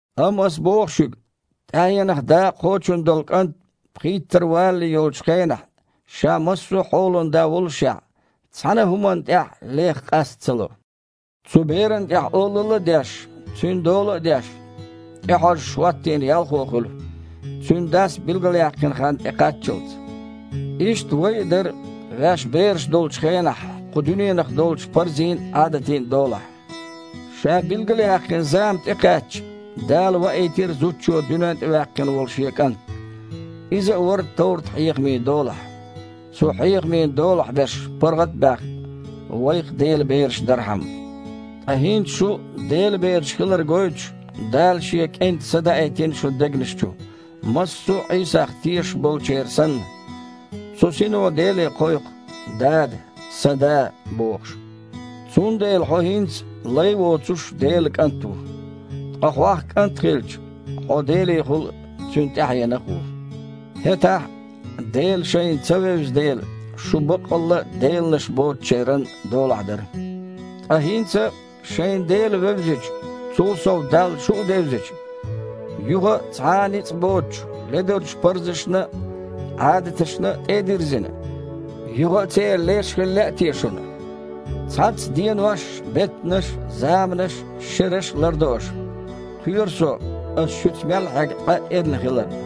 Амма аса боху шуьга: тІаьхьенах дакъа кхочун долу кІант пхийттара валале йолчу хенахь, ша массо а хьолан да воллушехь, цхьана а хІуманна тІехь лех къаста ца ло. Цу берана тІехь олалла а деш, цуьнан дола а деш, тІехьожуш хІоттийна ялхо хуьлу, цуьнан дас билгалъяьккхина хан тІекхаччалц. Иштта вай а дара, ваьш бераш долчу хенахь, кху дуьненах долчу парзийн а, Іадатийн а долахь. Ша билгалъяьккхина зама тІекхаьчча, Дала ваийтира зудчо дуьнен тІе ваьккхина волу Шен КІант. Иза а вара товрат-хьехамийн долахь, цу хьехамийн долахь берш паргІат а баьхна, вайх а Делан бераш дархьама. Ткъа хІинца шу Делан бераш хилар гойтуш, Дала Шен КІентан Са даийтина шун дегнаш чу, массо а Іийсах тешаш болчеран санна. Цу Сино Деле кхойкху: «Дада, Сан Да!» – бохуш. Цундела хьо хІинца, лай а воцуш, Делан кІант ву. Ткъа хьох, кІант хилча, хьо Делехула Цуьнан тІаьхьенах а ву. ХІетахь, Дела шайна ца вевза дела, шу баккъалла а деланаш боцучеран долахь дара. Ткъа хІинца, шайна Дела вевзича, цул сов Далла шу а девзича, юха а цхьа а ницкъ боцучу, ледарчу парзашна а, Іадаташна а тІе а дирзина, юха а церан леш хила лаьа те шуна? Цхьацца денош а, беттанаш а, заманаш а, шераш а лардо аша! Кхоьру со, аса шуьца мел хьегна къа эрна хиларна.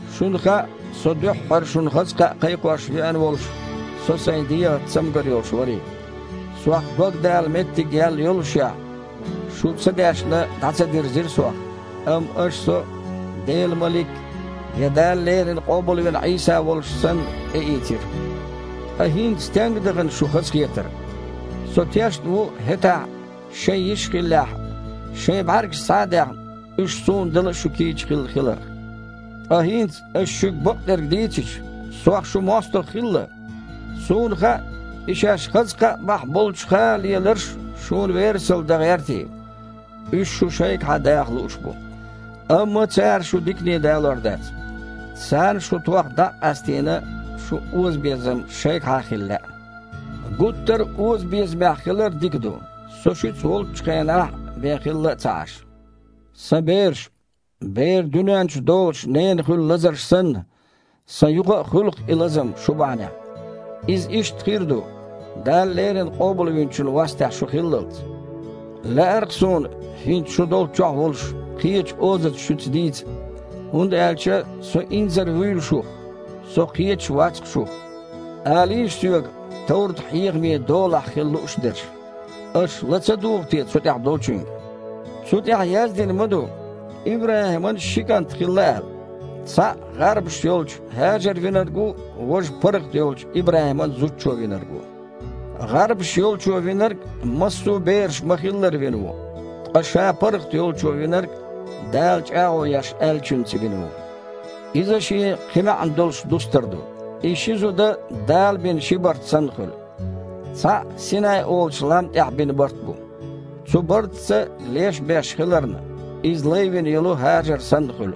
Шуна хаьа, со дуьххьара шуна хаза кхаъ кхайкхош веана волуш, со сайн дегІаца цамгар йолуш варий. Сох дог дала меттиг яьлла йоллушехь, шу ца даьшна дІа ца дирзира сох, амма аша со, Делан малик я Дала леррина къобалвина Іийса волуш санна, тІеийцира. Ткъа хІинца стенга дахана шун хазахетар? Со тешна ву, хІетахь, шайн йиш хиллехь, шайн бІаьргаш схьа а даьхна, уьш суна дала а шу кийча хилла хиларх. Ткъа хІинца, аса шуьга бакъдерг дийцича, сох шун мостагІа хилла? Суна хаьа и шаьш хаза кхаъ бахьа болчух леларш шуна верасалла дан гІертий. Уьш шу шайгахьа даха лууш бу. Амма цара шу дикане далор дац. Царна, шу тхох дІа а къастийна, шун озабезам шайгахьа хила лаьа. Гуттар а озабезамехь хилар дика ду, со шуьца волччу хенахь бен хилла а ца Іаш. Сан бераш! Бер дуьненна чу долуш ненан хуьлу лазарш санна, сан юха а хуьлу-кх и лазам шу бахьанехь. Иза иштта хир а ду, Дала леррина Къобалвинчун вастехь шу хиллалц. Лаьар-кха суна, хІинца шу долччохь а волуш, кхечу озаца шуьца дийца, хІунда аьлча со инзар а вуьйлу шух, со кхеташ а вац-кх шух. Алийша соьга, товрат-хьехамийн долахь хила лууш дерш, аша ла ца дугІу те цу тІехь долчуьнга? Цу тІехь яздина ма-ду, ИбрахІиман ши кІант хилла аьлла. Цхьаъ гІарбаш йолчу ХІажара винарг ву, важа паргІат йолчу ИбрахІиман зудчо винарг ву. ГІарбаш йолчо винарг массо бераш ма-хиллара вина ву. Ткъа ша паргІат йолчо винарг Дала чІагІо еш аьллачуьнца вина ву. Иза шен кхин маьІна долуш дустар ду. И ши зуда Дала бина ши барт санна хуьлу. Цхьаъ Синай олучу лам тІехь бина барт бу. Цу бартаца леш беш хиларна, иза лай вина йолу ХІажар санна хуьлу.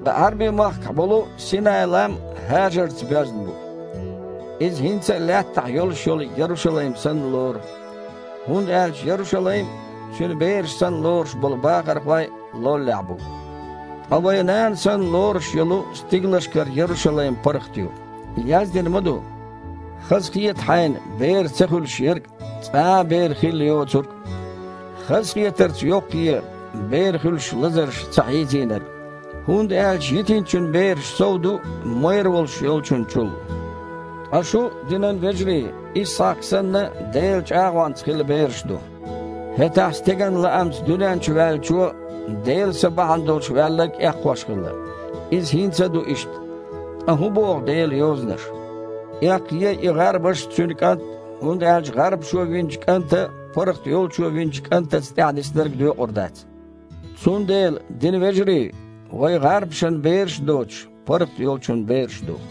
Ткъа Іаьрби-махкахь болу Синай-лам «ХІажарца» боьзна бу. Иза хІинца а лаьттахь йолуш йолу Ярушалайм санна лору. ХІунда аьлча Ярушалайм а, Цуьнан бераш санна лоруш болу бахархой а лоллехь бу. Ткъа вайн нана санна лоруш йолу стигалшкара Ярушалайм паргІат ю. Яздина ма-ду: «Хазахета хьайна, бер ца хуьлуш ерг, цкъа а бер хилла а йоцург! Хазахетарца йоккхае, бер хуьлуш лазарша ца хьийзийнарг, хІунда аьлча йитинчун бераш сов ду, майра волуш йолчун чул». Ткъа шу, динан вежарий, Исхьакх а санна, Делан чІагІонца хилла бераш ду. ХІетахь стеган лаамца дуьнен чу ваьллачо Делан Са бахьана долуш ваьлларг эккхош хилла. Иза хІинца а ду иштта. Ткъа хІун боху Делан Йозанаша? «Эккхае и гІарбаш а, цуьнан кІант а, хІунда аьлча гІарбашо винчу кІанта паргІат йолчо винчу кІантаца тІаьхьадисинарг доькъур дац». Цундела, динан вежарий, вай гІарбашан бераш а доцуш, паргІат йолчун бераш ду.